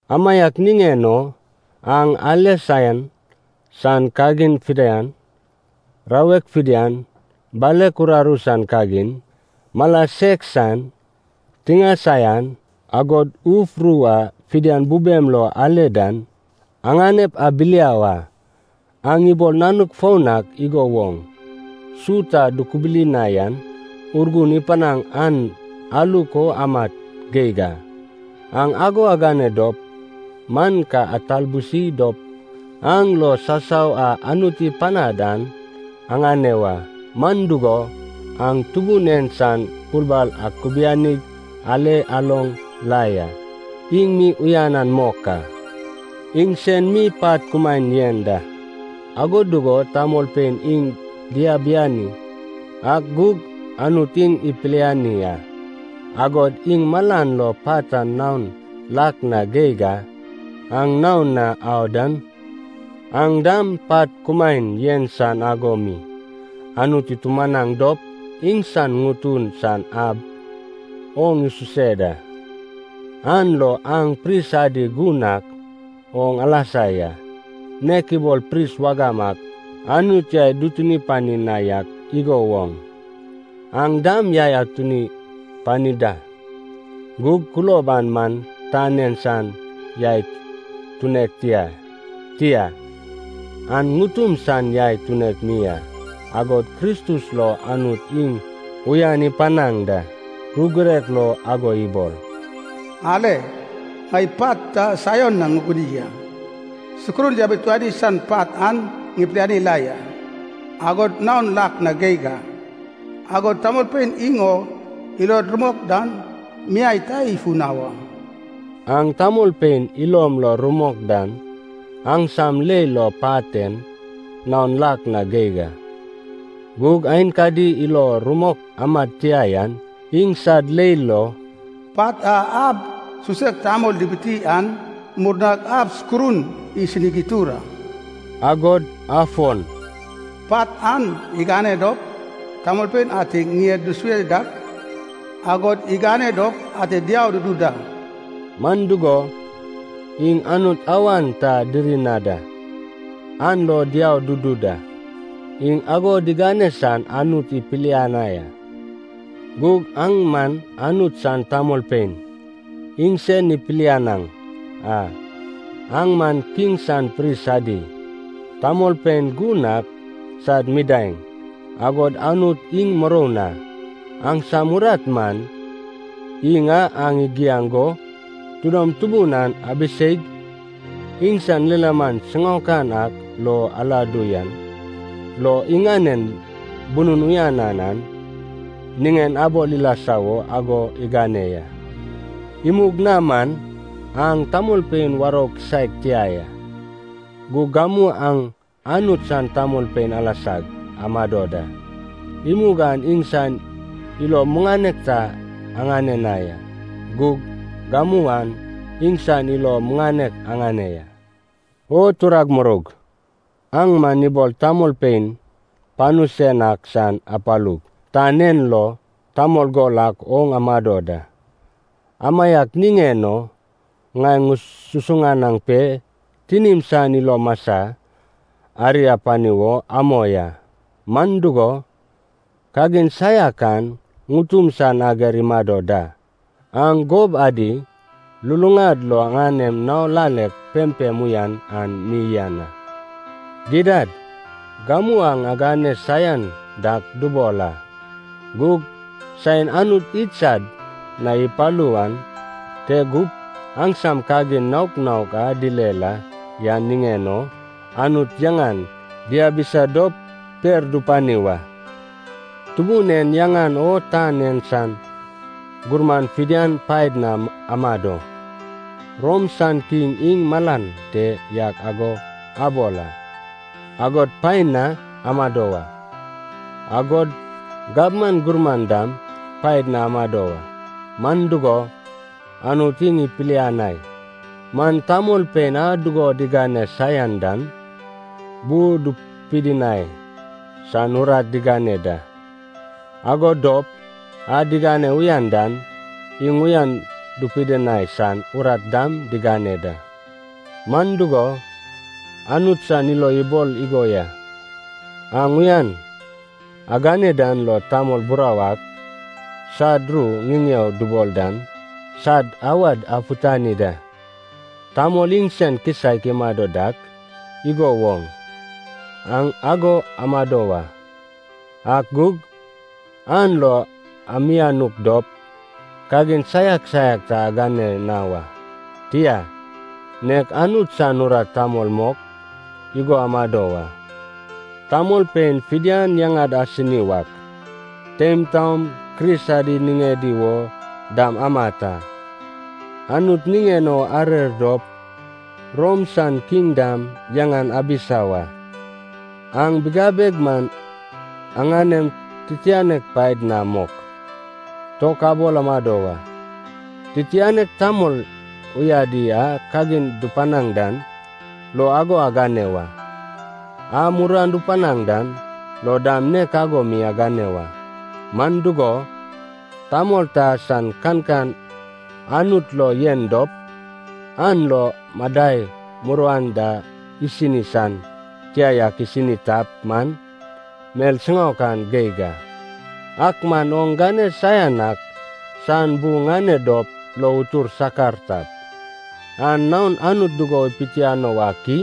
Amaiak niŋen o aŋ ale saian san kagin fidian, rawek fidian, balek uraru san kagin, mala sek san tiŋae saian, agod uf ru a fidian bubem lo ale dan, aŋanep abiliau a. Aŋ ibol nanuk foun ak igo woŋ, su ta dukubuli na yan Urgun ipanaŋ an aluk o amat geig a. Aŋ ago agane dop man ka atalbusi dop an lo sasau a Anut ipanad an aŋane wa. Man dugo, aŋ Tubun en san bulbal akubianig ale aloŋ la ya, iŋ mi uyanan mok a. Iŋsen mi pat kumaen yen da. Ago dugo tamolpein iŋ diabiani ak gug Anut iŋ ipiliani a, agod iŋ malan lo pat an naon lak na geig a. Aŋ naon na au dan, aŋ dam pat kumaen yen san ago mi Anut itumanaŋ dop iŋsan ŋutun san ab oŋ isuse da. An lo aŋ pris adi gun ak oŋ alasa ya. Nek ibol pris wagam ak Anut yai dutuni pani na yak igo woŋ, aŋ dam yai atuni pani da. Gug kulob an man tan en san yai tunek tia, tia, an ŋutum san yai tunek mi a, agod Kristus lo Anut iŋ uyan ipanaŋ da. Ru girek lo ago ibol, “Ale, ŋai pat ta Saion na ŋuguni a. Sukurun yabituani san pat an pilianek la ya, agod naon lak na geig a, agod tamolpein iŋ o ilod rumok dan, miai ta ifu na wa.” Aŋ tamolpein ilom lo rumok dan aŋsam leil lo pat en naon lak na geig a. Gug aenkadi ilo rumok amad tia yan iŋsad leil lo, “Pat a ab susek tamol dibiti an murnag ab sukurun isinig itur a.” Agod afon, “Pat an igane dop tamolpein ate ŋied dusue dak, agod igane dop ate diau dudu da.” Man dugo, iŋ Anut awan ta diri na da, an lo diau dudu da. Iŋ ago digane san Anut ipilianai a. Gug aŋ man Anut san tamolpein iŋsen ipilianaŋ a. Aŋ man Kiŋ san pris adi, tamolpein gun ak sad midaeŋ, agod Anut iŋ muroun a. Aŋsam urat man, iŋ a aŋ igiaŋ go tidom tubun an abiseig, iŋsan lilaman siŋaokan ak lo aladu yan lo, iŋanen bunun uyanan an niŋen abol ilasa wo ago igane ya. Imug na man aŋ tamolpein warou kisaek tia ya. Gug gamu aŋ Anut san tamolpein alasag amado da. Imug aŋ iŋsan ilo muŋanek ta aŋane na ya. Gug gamu aŋ iŋsan ilo muŋanek aŋane ya. O turag muroug, aŋ man ibol tamolpein panu sen ak san apalug tan en lo tamol gol ak oŋ amado da. Amaiak niŋen o, ŋai ŋususuŋanaŋ pe tinim san ilo masa ari apani wo amoi a. Man dugo, kagin saiak an ŋutum san ager imado da. Aŋ gob adi luluŋad lo aŋanem nao lalek pempem uyan an mi yen a. Gidad gamu aŋ agane saian dak dubol a. Gug saen Anut idsad na ipalu wan te gup aŋsam kagin naok naok a dile la yan niŋen o Anut yaŋan diabisa dop per dupani wa. Tubun en yaŋan o tan en san gurman fidian paed na amado. Rom san kiŋ iŋ malan te yak ago abol a, agod paen na amado wa. Agod gabman gurman dam paed na amado wa, man dugo, Anut iŋ ipilianai man tamolpein a dugo digane saian dan bu dupidinai san urat digane da, ago dop a digane uyan dan iŋ uyan dupidinai san urat dam digane da. Man dugo, Anut san ilo ibol igo ya, aŋ uyan agane dan lo tamol burau ak sad ru ŋiŋeo dubol dan sad awad afutani da. Tamol iŋsen kisaek imado dak igo woŋ, aŋ ago amado wa. Ak gug, an lo amianuk dop kagin saiak saiak ta agane na wa. Tia, nek Anut san urat tamol mok igo amado wa. Tamolpein fidian yaŋad asini wak, teim taom Kris adi niŋedi wo dam amat a. Anut niŋen o arer dop, Rom san kiŋ dam yaŋan abisa wa. Aŋ bigabeg man aŋanem titianek paed na mok, tok abol amado wa. Titianek tamol uyadi a kagin dupanaŋ dan lo ago agane wa, a muruan dupanaŋ dan lo dam nek ago mi agane wa. Man dugo, tamol ta san kankan Anut lo yen dop, an lo madai muruan da isini san tia yak isini tap man, mel siŋaokan geig a. Ak man oŋ gane saian ak san bu ŋane dop lo utur sakar tap, an naon Anut dugo ipitiano wak i?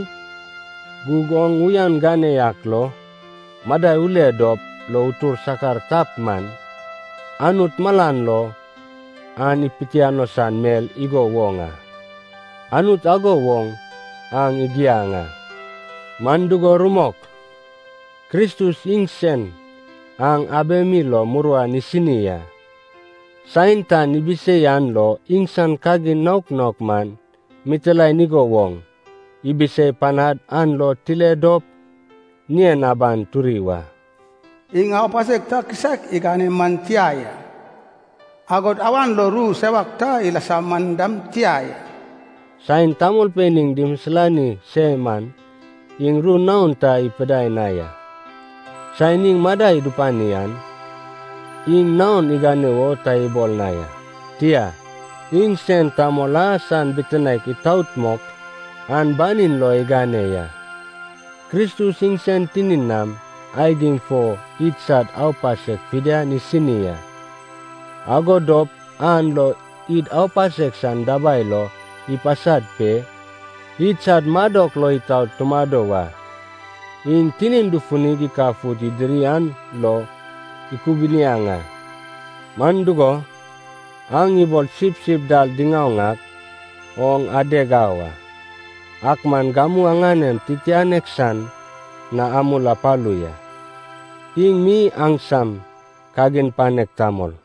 Gug oŋ uyan gane yak lo madai ule dop lo utur sakar tap man, Anut malan lo an ipitiano san mel igo woŋ a. Anut ago wo aŋ igiaŋ a. Man dugo rumok, Kristus iŋsen aŋ abemi lo muruan isini a. Saen tan ibisei an lo iŋsan kagin naok naok man mitilaen igo woŋ ibisei panad an lo tile dop ŋien aban turi wa. “Iŋ aupasek ta kisaek igane man tia ya. Agod awan lo ru sewak ta ilasa man dam tia ya.” Saen tamolpein iŋ dimisilani se man iŋ ru naon ta ipidai na ya. Saen iŋ madai dupani an iŋ naon igane wo ta ibol na ya. Tia, iŋsen Tamol a san bitinaek itaot mok an banin lo igane ya. Kristus iŋsen tinin nam aigim fo idsad aupasek fidian isini a. Ago dop an lo id aupasek san dabai lo ipasad pe, idsad madok lo itaot tumado wa. Iŋ tinin dufunig ikafut idiri an lo ikubiniaŋ a. Man dugo, aŋ ibol sipsip dal diŋaoŋ ak oŋ adeg au a. Ak man gamu aŋanem Titianek san na amul apalu ya. Iŋ mi aŋsam Kagin Panek Tamol.